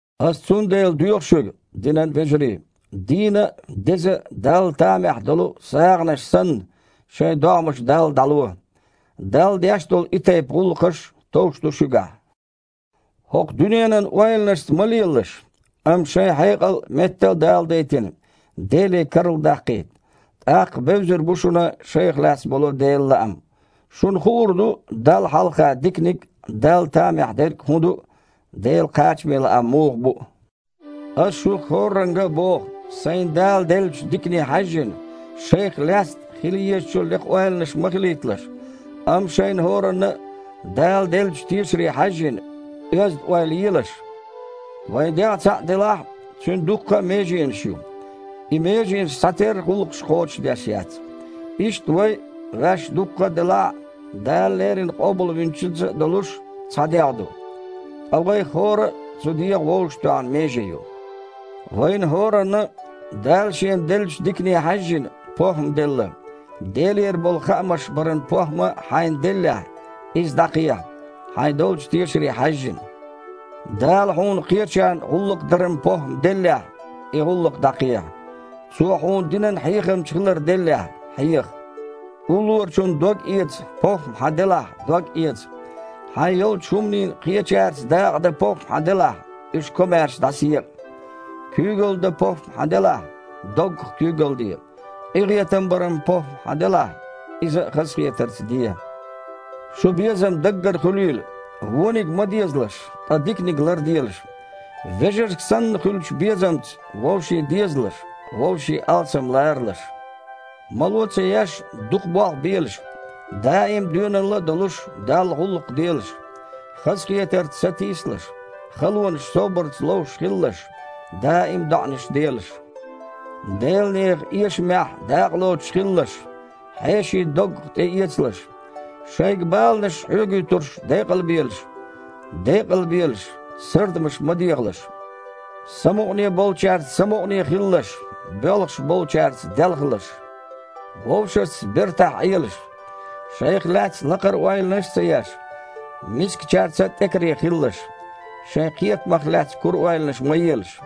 Аса цундела доьху шуьга, динан вежарий, дийна а, деза а, Далла тамехь долу а сагІанаш санна, шайн догІмаш Далла дІало. Далла деш долу и тайпа гІуллакхаш товш ду шуьгахь. ХІокху дуьненан ойланашца ма лелалаш, амма шайн хьекъал, метта а даладайтина, Деле карладаккхийта. ТІаккха бевзар бу шуна шайх лаьцна болу Делан лаам. Шуна хуур ду Далла хьалха диканиг а, Далла тамехь дерг а хІун ду а, Делан кхачаме лаам муха бу а. Аса шух хІорранга а боху, сайна Дала деллачу дикане хьаьжжина: шайх лаьцна хила езачул лекха ойланаш ма хилийталаш, амма, шайна хІоранна а Дала деллачу тешаре хьаьжжина, оьзда ойла елаш. Вайн дегІ цхьаъ делахь а, цуьнан дуккха а меженаш ю. И меженаш цхьатерра гІуллакхаш кхочушдеш яц. Иштта вай а, ваьш дукха делахь а, Дала леррина Къобалвинчуьнца а долуш, цхьа дегІ ду, ткъа вайх хІора а цу дегІан вовшахтоьхна меже ю. Вайна хІоранна а, Дала шена деллачу дикане хьаьжжина, похІма делла. Делера болу хаамаш баран похІма хьайна деллехь, иза дІакхехьа, хьайн долчу тешаре хьаьжжина. Дала хьуна кхечарна гІуллакх даран похІма деллехь, и гІуллакх дІакхехьа. Цо хьуна динан хьехамча хилар деллехь, хьеха. Уллорачун догъэца похІма хьан делахь – догъэца. Хьайн йолчу хІуманийн кхечаьрца дакъа дан похІма хьан делахь, уьш комаьрша дІасаекъа. Куьйгалла дан похІма хьан делахь, доггах куьйгалла де. Къинхетам баран похІма хьан делахь, иза а хазахетарца де. Шун безам даггара хуьлийла. Вониг ма дезалаш, ткъа диканиг ларделаш. Вежаршка санна хуьлучу безамца вовшийн дезалаш, вовшийн алсам ларалаш. Мало а ца еш, дукха болх белаш. Даим доьналла а долуш, Далла гІуллакх делаш. Хазахетарца сатийсалаш. Халонаш собарца ловш хилалаш. Даим а доІанаш делаш. Делан нехан эшамехь дакъалоцуш хилалаш, хьеший доггах тІеэцалаш. Шайга баланаш хьоьгуьйтурш декъалбелаш. Декъалбелаш, сардамаш ма дехалаш. Самукъане болчаьрца самукъане хилалаш, боьлхуш болчаьрца делхалаш. Вовшашца бертахь Іелаш. Шайх лаьцна лакхара ойланаш а ца еш, мискачаьрца а тІекаре хилалаш. Шайн кхетамах лаьцна кура ойланаш ма елаш.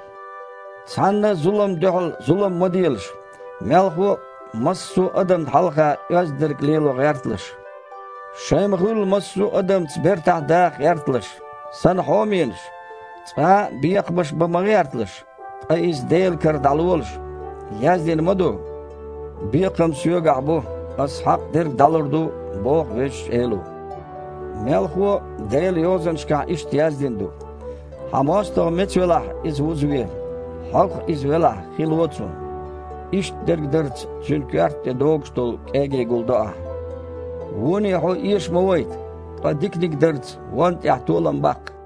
Цхьанна а зуламна дуьхьал зулам ма делаш, мелхо а, массо а адамна хьалха оьзда дерг лело гІерталаш. Шайн ма-хуьллу, массо а адамца бертахь даха гІерталаш. Сан хьоменаш! Цкъа а бекхамаш бан ма гІерталаш, ткъа иза Делан кара дІалолаш. Яздина ма ду: «„Бекхам Соьгахь бу, Ас хьакъ дерг дІалур ду“, – боху Везачу Эло». Мелхо а Делан Йозанашкахь иштта яздина ду: «Хьан мостагІа меца велахь, иза вузаве. Хьогах иза велахь – хи ло цунна. Иштта дерг дарца цуьнан коьрта тІе догуш долу кІегий гулдо ахьа». Воне хьо эша ма вайта, ткъа диканиг дарца вонна тІехь толам баккха.